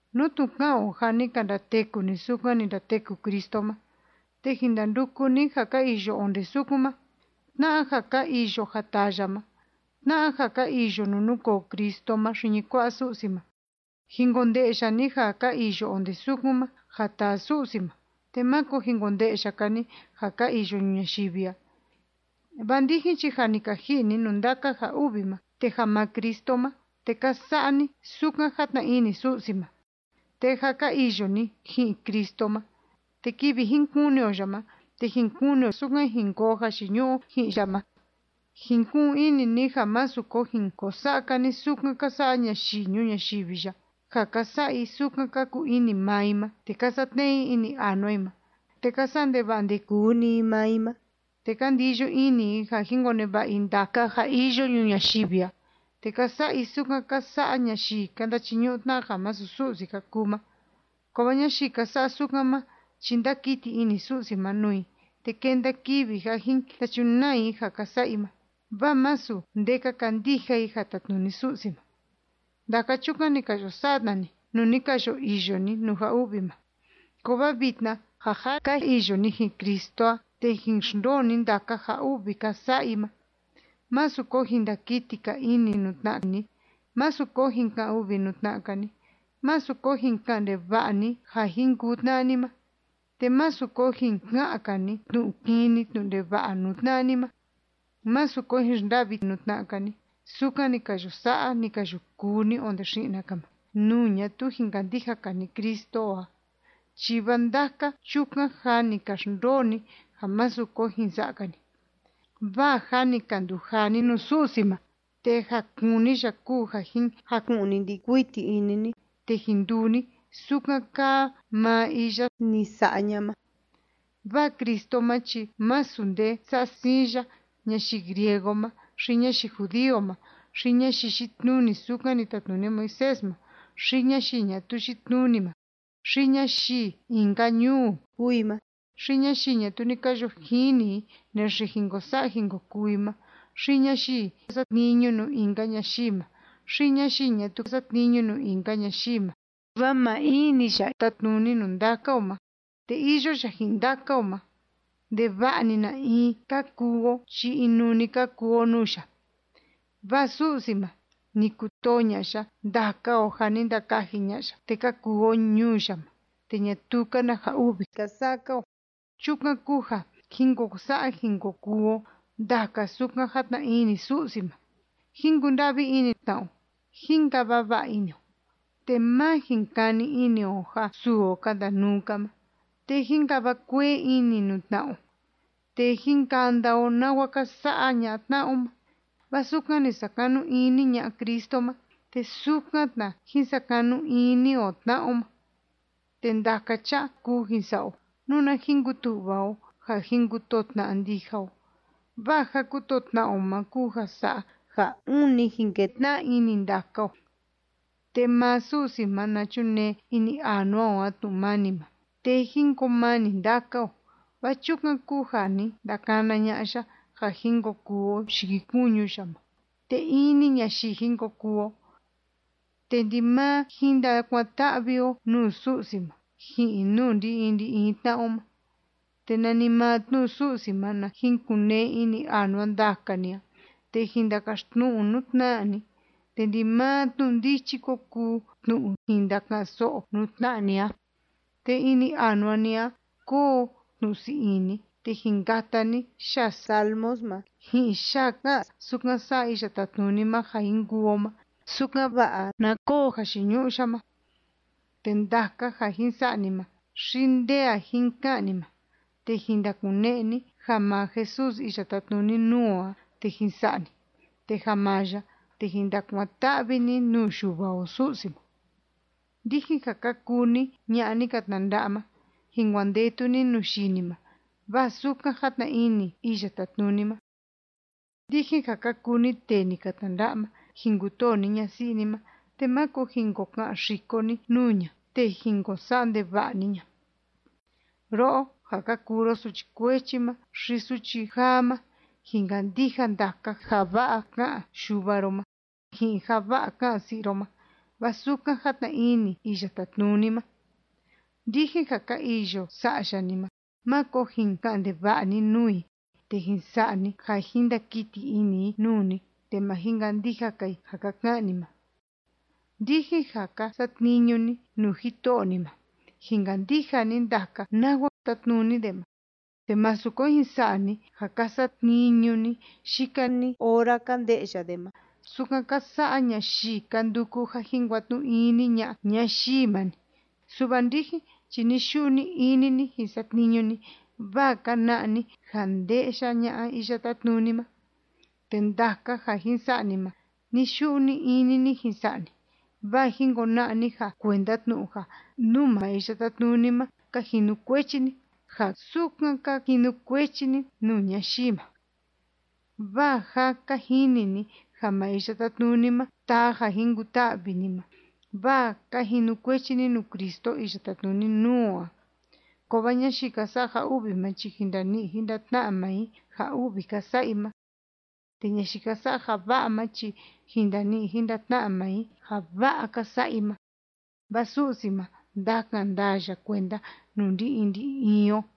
Nú tnu ka'an o ja ni ka ndateku ni sukan ni ndateku Cristo ma, te jin ndanduku ni ja ka iyo onde sukun ma, tna'a ja ka iyo ja taa ya ma, tna'a ja ka iyo nuu núkoo Cristo ma xiñi kua'a Su'si ma. Jin konde'ya ni ja ka iyo onde sukun ma, ja taa Su'si ma, te máko jin konde'ya‑ka ni ja ka iyo ñuu ñayivi a. Vaa ndijin chi ja ni ka ji'i ni nuu ndaka ja u'vi ma, te ja maa Cristo ma, te ka sa'a ni sukan játna ini Su'si ma. Te jâ ka iyo ni ji'in Cristo ma, te kivi jin kuni o ya ma, te jin kuni o sukan jin koo jayiñu'u o ji'in ya ma. Jin ku'un ini ni ja másu ko jin ko sa'a‑ka ni sukan ka sa'a ñayii ñuu ñayivi ya, ja ka sa'a i sukan ka kuu ini maa i ma, te ka satne'e i ini anua i ma, te ka sa'a ndeva'a ndekuu‑ni i maa i ma, te ka ndiyo ini i ja jin koneva'a i ndaka ja iyo ñuu ñayivi a, te ka sa'a i sukan ka sa'a ñayii ka ndachiñu'u tna'a ja masu Su'si ka kuu ma. Kovaa ñayii ka sa'a sukan ma chi ndákiti ini Su'si ma nuu i, te kenda kivi ja jin ndachunaa i ja ka sa'a i ma, vaa masu nde ka kandija i ja tátnuni Su'si ma. Ndaka chukan ni ka yo sa'a tna ni, nuu ni ka yo iyo ni nuu ja u'vi ma. Kovaa vitna ja jâ ka iyo ni ji'in Cristo a, te jin xndoo ni ndaka ja u'vi ka sa'a i ma. Másu ko jin ndakiti‑ka ini nuu tna'a ni. Másu ko jin ka'an u'vi nuu tna'a‑ka ni. Másu ko jin ka'an ndeva'a ni ja jin kuu tna'a ni ma. Te másu ko jin ka'an‑ka ni tnu'u kini tnu'u ndeva'a nuu tna'a ni ma. Másu ko jin xnda'vi nuu tna'a‑ka ni, sukan ni ka yo sa'a, ni ka yo kuu ni onde xi'na‑ka ma, nuu ñatuu jin kandija‑ka ni Cristo o a, chi vaa ndaka chukan jâ ni ka xndoo ni ja másu ko jin sa'a‑ka ni. Vaa jâ ni ka ndujaa ni nuu Su'si ma. Te ja kúni ya kúu ja jin jaku'ni ndi'i kuiti ini ni, te jin nduu ni sukan kaa maa iya ni sa'a ña'a ma. Vaa Cristo ma chi masu nde sa'a siin ya ñayii griego ma, xi ñayii judío ma, xi ñayii yitnuni sukan ni tatnuni Moisés ma, xi ñayii ñatuu yitnuni ma, xi ñayii in‑ka ñuu kúu i ma, xi ñayii ñatuu ni ka yo jini i naxe jin ko sa'a jin ko kuu i ma, xi ñayii satniñu nuu in‑ka ñayii ma, xi ñayii ñatuu satniñu nuu in‑ka ñayii ma, vaa maa in‑ni ya tátnuni nuu ndaka o ma, te iyo ya ji'in ndaka o ma, ndeva'a‑ni na in ka kuu o chi inuu‑ni ka kuu o nuu ya. Vaa Su'si ma, ni kutoo ña'a ya ndaka o ja ni ndakaji ña'a ya te ka kuu o ñuu ya ma te ñatuu‑ka na ja u'vi ka sa'a‑ka o. Chukan kúu ja jín ko sa'a jín ko kuu o ndaka sukan játna ini Su'si ma. Jín kunda'vi ini tna'a o. Jín kava va'a ini o, te má jin kani ini o ja suu o ka ndanuu‑ka ma. Te jín kava kuee ini nuu tna'a o, te jín kanda o nawa ka sa'a ña'a tna'a o ma. Vaa sukan ni sakanu ini ña'a Cristo ma, te sukan tna jín sakanu ini o tna'a o ma. Te ndaka cha'a kuu jin sa'a o, nuna jin kutu'va o ja jin kutoo tna'a ndija o, vaa ja kutoo tna'a o ma kúu ja sa'a ja ûni jin ketna'a ini ndaka o. Te maa Su'si ma na chunee ini anua o a tnu'u mani ma, te jín koo mani ndaka o, vaa chukan kúu ja ni ndakana ña'a ya ja jin ko kuu o yikikuñu ya ma, te in‑ni ñayii jin ko kuu o. Te ndimaa jin ndakuan‑ta'vi o nuu Su'si ma ji'in nuu ndi‑in ndi‑in tna'a o ma. Te nanimaa tnu'u Su'si ma na jin kun‑nee ini anua ndaka ni a, te jin ndakaxtnu'u nuu tna'a ni, te ndimaa tnu'u ndichi ko kuu tnu'u jin ndaka'an‑so'o nuu tna'a ni a. Te ini anua ni a koo tnu'u sii ini, te jin kata ni yaa salmos ma, ji'in yaa ká'an sukan sa'a Iya Tátnuni ma ja jin kuu o ma, sukan‑va'a na koo jayiñu'u ya ma. Te ndaka ja jin sa'a ni ma, xi nde a jin ka'an ni ma, te jin ndakune'e ni ja maa Jesús iya tátnuni nuu o a, te jin sa'a ni. Te ja maa ya, te jin ndakuan‑ta'vi ni nuu Yuva o Su'si ma. Ndijin ja ka kuu ni ña'a ni ka tnanda'a ma, jin kuandetu ni nuu yii ni ma, vaa sukan játna ini Iya Tátnuni ma. Ndijin ja ka kuu ni tee ni ka tnanda'a ma, jin kutoo ni ñasi'i ni ma, te máko jin ko ka'an xiko ni nuu ña te jin ko sa'a ndeva'a ni ña. Ro'o ja ka kuu ro suchi kuechi ma xi suchi jaa ma, jin kandija ndaka ja va'a ká'an yuva ro ma, ji'in ja va'a ká'an si'i ro ma. Vaa sukan játna ini Iya Tátnuni ma. Ndijin ja ka iyo sa'ya ni ma, máko jin ka'an ndeva'a ni nuu i te jin sa'a ni ja jin ndakiti ini i nuu ni te ma jin kandija‑ka i ja ka ka'an ni ma. Ndijin ja ka satniñu ni nuu jito'o ni ma, jin kandija ni ndaka nawa tátnuni de ma, te másu ko jin sa'a ni ja ka satniñu ni yika‑ni ora ka nde'ya de ma, sukan ka sa'a ñayii ka nduku ja jin kuatnu'u ini ña'a ñayii ma‑ni. Su'va ndijin chi ni‑yu'u ni‑ini ni jin satniñu ni, vaa ka na'a ni ja nde'ya ña'a Iya Tátnuni ma. Te ndaka ja jin sa'a ni ma, ni‑yu'u ni‑ini ni jin sa'a ni, vaa jin kona'a ni ja kuenda tnu'u ja nuu maa Iya Tátnuni ma ka jinukuechi ni, ja sukan ka jinukuechi ni nuu ñayii ma. Vaa jâ ka jini ni ja maa Iya Tátnuni ma taa ja jin kuta'vi ni ma, vaa ka jinukuechi ni nuu Cristo iya tátnuni nuu o a. Kovaa ñayii ka sa'a ja u'vi ma chi jin ndani'i jin ndatna'a maa i ja u'vi ka sa'a i ma. Te ñayii ka sa'a ja va'a ma chi jin ndani'i jin ndatna'a maa i ja va'a ka sa'a i ma. Vaa Su'si ma, ndakan ndaa ya kuenda nuu ndi‑in ndi‑in o.